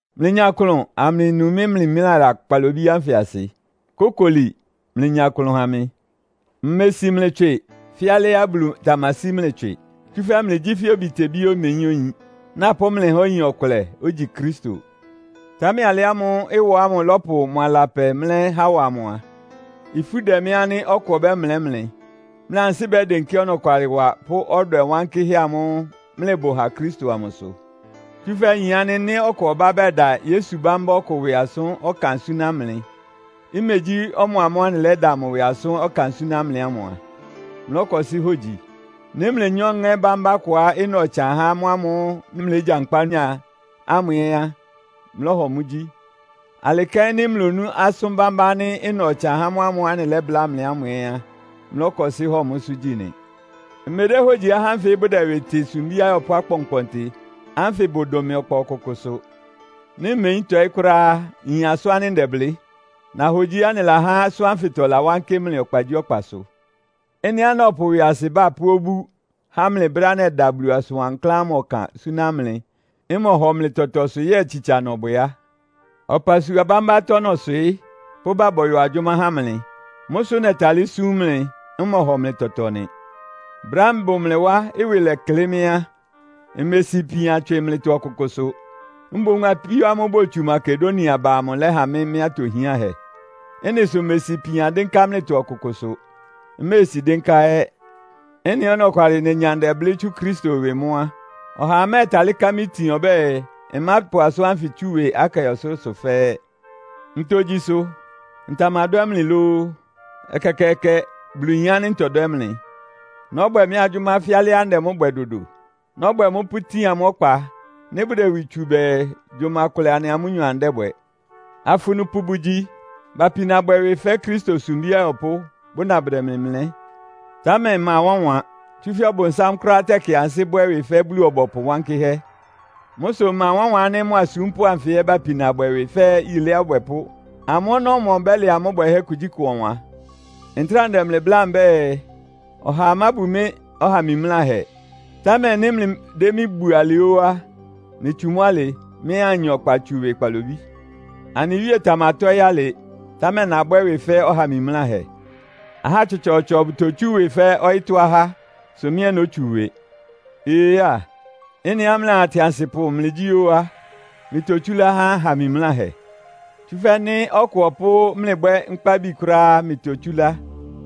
Mlɩnya klʋn, amlɩnu mɩ́ mimlála kpalobí ánfɩ asɩ! Kókoli, mlɩnya klʋn ha mɩ. Mmesi mlɩ tswɩ fɛ́ alɩá Bulu tamasí mlɩ tswɩ. Tsúfɛ́ mlɩgyí fɛ́ obitebíá omeyín oyin, napʋ́ mlɩ há oyin ɔkʋlɛ, ogyi Kristo. Támɛ alɩ ámʋ́ʋ́ ɩwɔ ámʋ lɔ́pʋ mʋ alapɛ mlɛ́ Hawa amʋ á, ifú dɛ mɩ́ ánɩ́ ɔkʋ ɔbɛ́mlɛ́ mlɩ, mlɩ ansɩ́ bɛ́dɩnkɩ́ ɔnɔkwalɩwa pʋ́ ɔdwɛ wankɩ́hɛ́ amʋ́ʋ́ mlɩbʋ ha Kristo amʋsʋ. Tsúfɛ́ nyin ánɩ́ nɩ́ ɔkʋ ɔbá bɛda Yesu bámbá ɔkʋ ɩwɩ asʋ́n ɔkan súná mlɩ, imegyí ɔmʋamʋ́ʋ́ anɩlɛ́da mʋ ɩwɩ asʋ́n ɔkan súná mlɩ ámʋ a, mlɔ́kɔsɩ́ hogyi. Nɩ́ mlenyá ɔŋɛ́ bámbá kʋá ɩna ɔtsan há mʋ́ámʋ́ʋ́ mlɩlégyankpá nyá ámʋ ɛ́ á, mlɔ́hɔ mʋ́ gyí. Alɩ kɛ́n nɩ́ mlonú asʋn bambá ánɩ́ ɩna ɔtsan há mʋ́ámʋ́ʋ́ anɩlɛ́bláa mlɩ ámʋ ɛ́ á, mlɔ́kɔsɩ́ hɔ mʋ́sʋ́ gyí nɩ! Mmedéhógyiá ahá ánfɩ́ bʋdɛ ɩwɩ tɩ “Sumbí ayɔpʋ́ akpɔnkpɔntɩ” ánfɩ bʋdʋn mɩ ɔkpa ɔkʋkʋsʋ. Nɩ́ mmeyín tɔɩ́ kʋ́ráá á, nyin asʋ́n ánɩ́ ndɛblɩ́. Nahogyiá anɩlahá asʋ́n ánfɩtɔ ɩlawánkɩ́ mlɩ ɔkpagyíɔkpasʋ. Ɩ́nɩá nɔpʋ ɩwɩasɩbá pʋ́ obú há mlɩ brɛ́á nɛda Bulu asʋn wankláán ámʋ ɔkan súná mlɩ, mmɔhɔ mlɩ tɔtɔ sʋ yɛ́ɛ tsitsa nɔbwɛ á? Ɔpasua bámbá atɔ́ nɔswɩɩ́, pʋ́bá bɔyɔ agyʋ́má há mlɩ. Mʋ́ sʋ nɛtalɩ́ súm mlɩ, mmɔhɔ mlɩ tɔtɔ nɩ. Brɛ́á mbʋ mlɩ wá, ɩwɩ lɛklɩ́ mɩ́ á, mmesi ipian tswɩ mlɩtɔ ɔkʋkʋsʋ. Mboún apíó ámʋ́ʋ́ botsu Makedonia ba amʋ lɛ́ha mɩ́ mɩ́ atohiánhɛ. Ɩ́nɩ sʋ mmesi ipian dɩ́nká mlɩtɔ ɔkʋkʋsʋ, mméesi dɩ́nká ɛ́. Ɩ́nɩá ɔnɔkwalɩ nenya ndɛblɩ́ tsú Kristo ɩwɩ mʋ́ á, ɔhaa mɛ́ɛtalɩ́ ká mɩ́ itin ɔbɛ́ɛ, mmápʋ asʋ́n ánfɩ tsú ɩwɩ Akaia ɔsʋlʋ́sʋ fɛ́ɛ́. Ntogyi sʋ? Ntamadwɛ́ mlɩ lóó? Ɛkɛkɛɛkɛ! Bulu yin ánɩ́ ntɔdwɛ́ mlɩ! Nɔ́bwɛ mɩ́ agyʋ́má fɛ́ alɩá ndɛ mʋ́ bwɛ dodo. Nɔ́bwɛ mʋ́ pʋ́tin amʋ́ ɔkpa, nɩ́ bʋdɛ ɩwɩ tsu bɛɛ, gyʋma kʋlɛ anɩa amʋ́nyɔ anɩdɛ́bwɛ. Afunupʋ bʋgyi. Bapina bwɛ ɩwɩ fɛ́ Kristo sumbí ayɔpʋ́, bʋna bʋdɛ mlɩ mlɛ́. Támɛ ɩma wánwan! Tsúfɛ́ Ɔbʋnsám kʋ́ráá tɛkɩ ansɩ́ bwɛ́ ɩwɩ fɛ́ Bulu-ɔbɔpʋ wankɩ́hɛ́! Mʋ́ sʋ ɩma wánwan ánɩ́ mʋ asúmpʋ́ anfɩ ɛ́ bapina bwɛ ɩwɩ fɛ́ yilé abwɛpʋ́. Amʋ́ ɔnɔ́mɔ bɛ́lɛ amʋ́ bwɛhɛ́ kugyíkʋ ɔwan. Ntráa ndɛ mlɩ bláa mbɛ́ɛ, ɔhaa mábu mɩ́ ɔha mimláhɛ. Támɛ nɩ́ mlɩdɛ́ mɩ́ bu alɩ óó á, mlɩtsu mʋ́ alɩ, mɩ́ ɛ́ anya ɔkpa tsú ɩwɩ kpalobí. Anɩ Wíe tamatɔ́ɩ́ alɩ, támɛ nabwɛ́ ɩwɩ fɛ́ ɔha mimláhɛ. Ahá tsɔtsɔɔtsɔ bʋtotsú ɩwɩ fɛ́ ɔyɩ́tɔ́ ahá, sʋ mɩ́ ɛ́ nótsu ɩwɩ. Ee á, ɩ́nɩá mlɩaa atɩansɩpʋ mlɩgyí óó á, mlɩtotsúlá há aha mimláhɛ. Tsúfɛ́ nɩ́ ɔkʋ ɔpʋ́ mlɩ bwɛ́ nkpábi kʋ́ráá á, mlɩtotsúlá.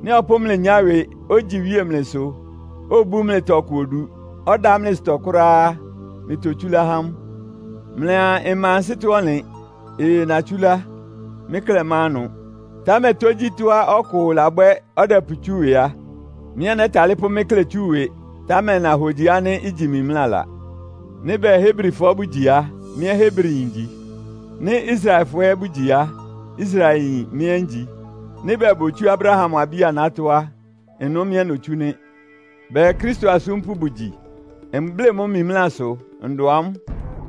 Nɩ́ ɔpʋ́ mlɩ nyá ɩwɩ, ogyi iwíe mlɩsʋ, obú mlɩ tɔkʋ odu, ɔdá mlɩ ɩsʋtɔ kʋ́ráá á, mlɩtotsúlá há mʋ. Mlɩa mma ansɩ́tɔ́-ɔnlɩn. Ee, natsúlá. Mɩ́ klɛ́ ma ɩnʋ. Támɛ tógyítɔ́á ɔkʋ labwɛ́ ɔdɛpʋtsú ɩwɩ á, mɩ́ ɛ́ nɛ́talɩ́ pʋ́ mɩ́ klɛ tsú ɩwɩ. (Támɛ nahogyi ánɩ́ igyi mimlála.) Nɩ́ bɛɛ Hebrifɔ bʋ́gyi á, mɩ́ ɛ́ Hebriyin ngyi. Nɩ́ Israelfɔ ɛ́ bʋgyi á, Israelyin mɩ́ ɛ́ ngyi. Nɩ́ bɛɛ botsú Abraham abí-anátɔ́ a, ɩnʋ mɩ́ ɛ́ notsú nɩ́. Bɛɛ Kristo asúmpʋ́ bʋgyi? Mblɩ́ mʋ́ mimlásʋ, ndʋn amʋ́!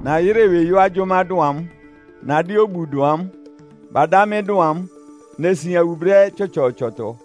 Nayɩ́rɩ ɩwɩ yɔ́ agyʋ́má dʋn amʋ́. Nadɩ́ obu dʋn amʋ́. Badá mɩ́ dʋn amʋ́. Nesian wu brɛ́ tsɔtsɔɔtsɔtɔ.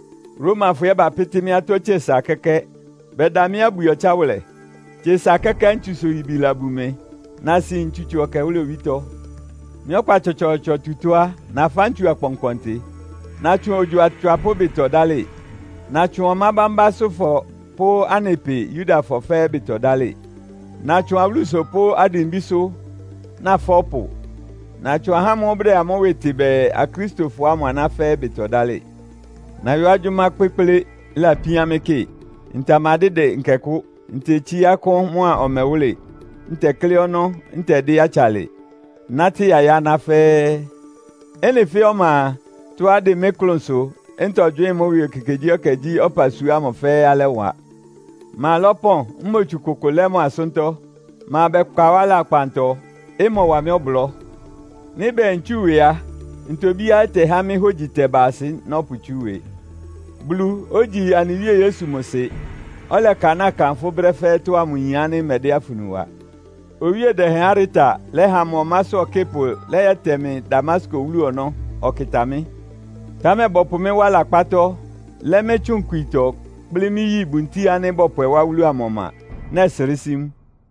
Romafɔ ɛ́ bapɩ́tɩ́ mɩ́ atɔ́ tse sa kɛ́kɛ́. Bɛda mɩ́ abwi ɔtsáwʋlɛ. Tse sa kɛ́kɛ́ ntsusʋ-yibi labun mɩ, nasin ntsutso ɛkɛwʋ́lɛ owítɔ́. Mɩ́ ɔkpa tsɔtsɔɔtsɔ tutɔ́ á, nafá ntsu akpɔnkpɔntɩ, natsʋn ogyo atswapʋ́ ɩbɩtɔ dálɩ. Natsʋn ɔmá bámbásʋ́fɔ pʋ́ anɩ pɩ Yudafɔ fɛ́ɛ́ ɩbɩtɔ dálɩ. Natsʋn awúlusʋ pʋ́ adimbísʋ́, nafá ɔpʋ. Natsʋn ahá ámʋ́ʋ́ bʋdɛ amʋ́ ɩwɩ tɩ bɛɛ, Akristofɔ ámʋ aná fɛ́ɛ́ ɩbɩtɔ dálɩ. Nayɔ́ agyʋ́má kpékplé, ɩlapíán mɩ́ kɩ. Ntamadɩ́dɩ nkɛkʋ́. Ntetsíá akʋ́n mʋ́a ɔmɛwʋ́lɩ, ntɛklɩ́ ɔnɔ́, ntɛdɩ́ atsalɩ, nátɩ́ yayá aná fɛ́ɛ́. Ɩ́nɩ fɛ́ɛ́ ɔma a, tɔ́á ɩdɩn mɩ́ klʋnsʋ, ntɔgywɩ́ɩn mʋ́ ɩwɩ ekekegyíɛkɛ gyí ɔpasua ámʋ fɛ́ɛ́ alɛ́wa. Ma lɔ́pɔn, mmotsu kʋkʋ lɛ́ mʋ asʋ́ntɔ́? Ma bɛkpa wá lakpantɔ, ɩmɔwa mɩ́ ɔblɔ́. Nɩ́ bɛɛ ntsú ɩwɩ á, ntobíá ɩtɛhá mɩ́ hógyi tɛba asɩ nɔ́pʋtsú ɩwɩ. Bulu, ogyí anɩ Wíe Yesu mʋ Sɩ, ɔlɛkanáa kanfʋ́ brɛ́ fɛ́ɛ́tɔ́ ámʋ yin ánɩ́ mmɛdɛ́ afunu wa. Owíe dɛhɛn Areta lɛ́ha mʋ ɔmásʋ́ ɔkɩ́pʋ lɛ́yɛtɛ mɩ Damasko wúlu ɔnɔ́, ɔkɩta mɩ́. Támɛ bɔpʋ mɩ́ wá lakpátɔ́, lɛ́ mɩ́ tsʋn ikwitɔ, kplɩ́ mɩ́ yi buntíi ánɩ́ bɔpwɛ wá wúlu amʋ ɔma, nɛsrɩ́ sí mʋ.